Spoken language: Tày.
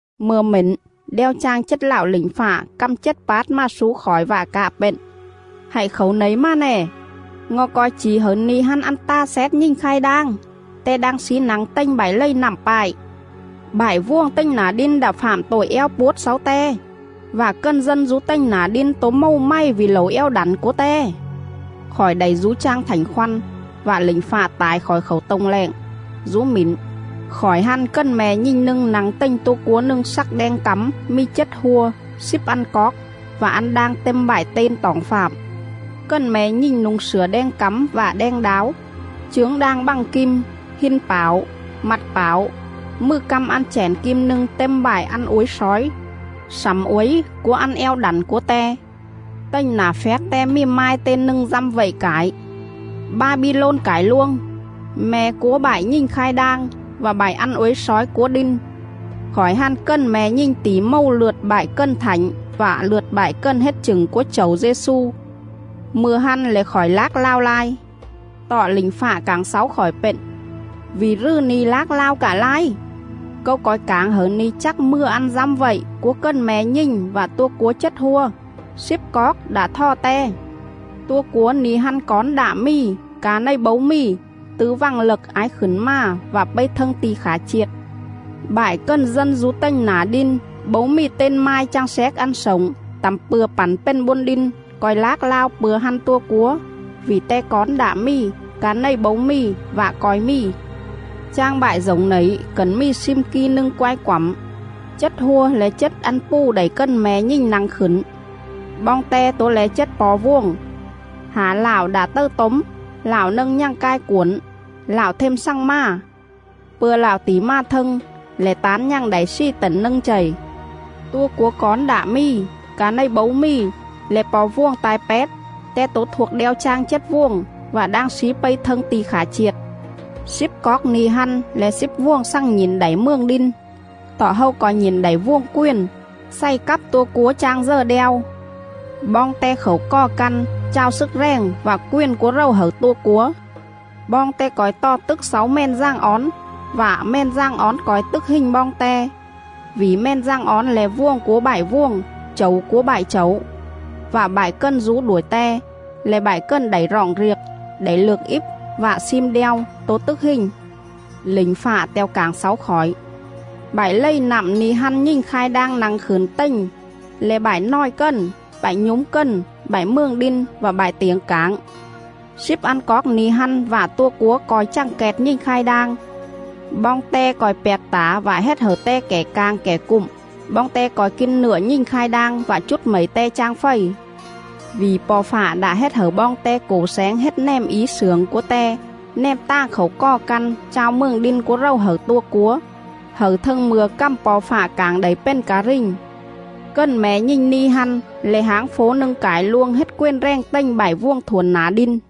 Mư̱a mển, đeo chang chết lạo lỉnh fạ căm chết pát mà slú khỏi vạ cạ pện: “Hạy khảu nẩy mà nè, ngo̱ co̱i chỉ hẩư ni̱ hăn ăn ta xét nhình khai đang, te đang slí nă̱ng tềnh bại lầy nặm pại.. Bại vuồng tềnh nả đin đạ fạm tội eo puốt xáu te, vạ cần dân dú tềnh nả đin tố mầu mày vỉ lẩu eo đẳn cúa te.”. Khỏi đảy dú chang Thảnh Khoăn, vạ lỉnh fạ tải khỏi khảu tô̱ng lẹng. Dú mỉn, khỏi hăn cần me̱ nhình nâng nă̱ng tềnh tua cúa nâng slắc đeng cắm mì chết hua, slíp ăn coóc, vạ ăn đang têm bại ten toỏng fạm.. Cần me̱ nhình nu̱ng slửa đeng cắm vạ đeng đáo, chướng đang bă̱ng kim, hin pảo, mặt pảo, mừ căm ăn chẻn kim nâng têm bại ăn uối slói, slẳm uối cúa ăn eo đẳn cúa te.. Tềnh nả phjác te mì mai ten nâng dăm vậy cải: “BA-BI-LÔN CẢI LUÔNG, ME̱ CÚA BẠI NHÌNH KHAI ĐANG VẠ BẠI ĂN UỐI SLÓI CÚA ĐIN.” Khỏi hăn cần me̱ nhình tỉ mầu lượt bại cần thảnh vạ lượt bại cần hết chửng cúa Chẩu Dê-xu. Mư̱a hăn lẻ khỏi lác lao lai. Tọ lỉnh fạ cảng xáu khỏi pện: “Vỉ rừ ni̱ lác lao cạ lai? Câu co̱i cảng hẩư ni̱ chắc mừa ăn dăm vậy cúa cần me̱ nhình vạ tua cúa chết hua, slíp coóc đạ thò te. Tua cúa ni̱ hăn cón đạ mì, ca này bấu mì, tứ vằng lậc ái khửn mà vạ pây thâng ti̱ khả chiệt. Bại cần dân dú tềnh nả đin bấu mì ten mai chang xéc ăn slổng tẳm pư̱a pẳn pền bôn đin co̱i lác lao pư̱a hăn tua cúa; vỉ te cón đạ mì, ca này bấu mì, vạ co̱i mì.. Chang bại dổng nẩy cẩn mì slim ki nâng quai quẳm. Chết hua le̱ chết ăn pù đảy cần me̱ nhình nă̱ng khửn. Boong te tố le̱ chết po̱ vuồng: Hả lạo đạ tầư tốm, lạo nâng nhằng cai cuổn, lạo them xằng mà. Pư̱a lạo tỉ mà thâng, lẻ tán nhằng đảy slì tẩn nâng chầy. Tua cúa cón đạ mì, ca này bấu mì, le̱ po̱ vuồng ta̱i pét; te tố thuộc đeo chang chết vuồng, vạ đang slí pây thâng ti̱ khả chiệt. Slíp coóc ni̱ hăn le̱ slíp vuồng xằng nhỉn đảy mường đin, tọ hâu co̱i nhỉn đảy vuồng quền xày cắp tua cúa chang dờ đeo.. Boong te khảu cò căn chao slức rèng vạ quền cúa rầu hẩư tua cúa. Boong te co̱i tò tức xáu Mèn Dàng Ón vạ Mèn Dàng Ón co̱i tức hình boong te, vỉ Mèn Dàng Ón le̱ Vuồng cúa bại vuồng, Chẩu cúa bại chẩu; vạ bại cần dú đuổi Te, le̱ bại cần đảy roọng riệc, đảy lược íp vạ slim đeo, tố tức hình.” Lỉnh fạ te̱o cảng xáu khỏi: “Bại lầy nặm ni̱ hăn nhình khai đang nă̱ng khửn tềnh le̱ bại nòi cần, bại nhúm cần, bại mường đin vạ bại tiểng cảng. Slíp ăn coóc ni̱ hăn vạ tua cúa co̱i chằng kẹt nhình khai đang. Boong te co̱i pjạc tả vạ hết hẩư te kẻ cảng kẻ cụm; boong te co̱i kin nựa nhình khai đang vạ chút mẩy te chang fầy. Vỉ Po̱ Fạ đạ hết hẩư boong te cổ xéng hết nèm í slưởng cúa Te nèm tàng khảu cò căn chao mường đin cúa rầu hẩư tua cúa, hẩư thâng mư̱a cằm Po̱ Fạ cảng đảy pền ca rình. Cần me̱ nhình ni̱ hăn le̱ háng fố nâng cải luông hết quền rèng tềnh bại vuồng thuổn nả đin.”